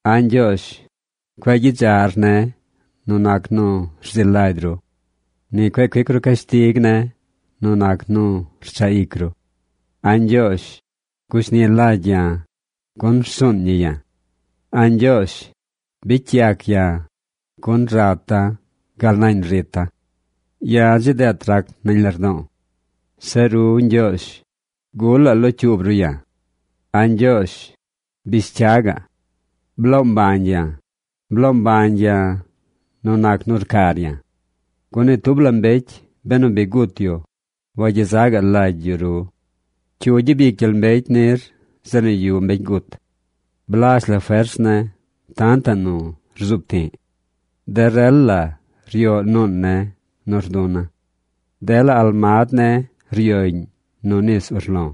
A̱ Ñgyoozh, cueꞌ gyidzaꞌr ne̱ nu nac nu rzi lagy ru. Ni cueꞌ cuic ru cashtig ne̱ nu nac nu rchaꞌ ic ru. A̱ Ñgyoozh, gushni lagy ya̱, gun rsuun ñi ya̱. A̱ Ñgyoozh, bicy yac ya̱, gun rata̱ gal nañ rita̱. Ya̱ dzi deet rac nañ lardo̱o̱. Zeꞌ ru Ñgyoozh, ¿gulaꞌ locyuub ru ya̱? A̱ Ñgyoozh, bish cya gaꞌ. ¡Bloo mbañ ya̱! ¡Bloo mbañ ya̱ nu nac nu rcar ya̱! Gun ni tub la mbecy, benu bi gut yu, wagyezaꞌ lagy yu ru. ¿Cyu gyabic gyel mbecy nir zeꞌ nu yuꞌ mbecy gut? Blazh la fers ne̱ tantaꞌ nu rzuub ti̱ꞌ. De rel la ryoꞌ nuun ne̱ nu rduna̱. Dela almad ne̱ ryoꞌñ nu nis urlo̱.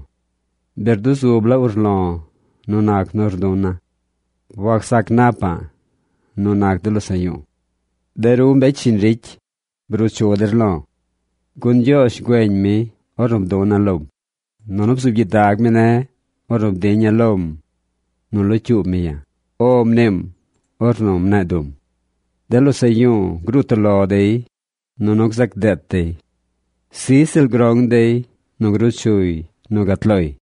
Bi rduzub la urlo̱ nu nac nu rduna̱. Wacsac napa̱ꞌ nu nac de losaꞌ yu̱u̱. ¡De ru mbecy shiñ ricy, bruu chu der lo̱! Gun Ñgyoozh güeñ mi ornu bduna̱ lom, nunu bzuub gyidag mi ne̱ ornu bdiña̱ lom nu locyuub mi ya̱. “O” mniim ornu mne̱e̱ dum. De losaꞌ yu̱u̱ gruu toꞌ lo dey, nunu gzac deet dey. ¡Sij ziꞌl grong dey gruu chuy nu gat loy!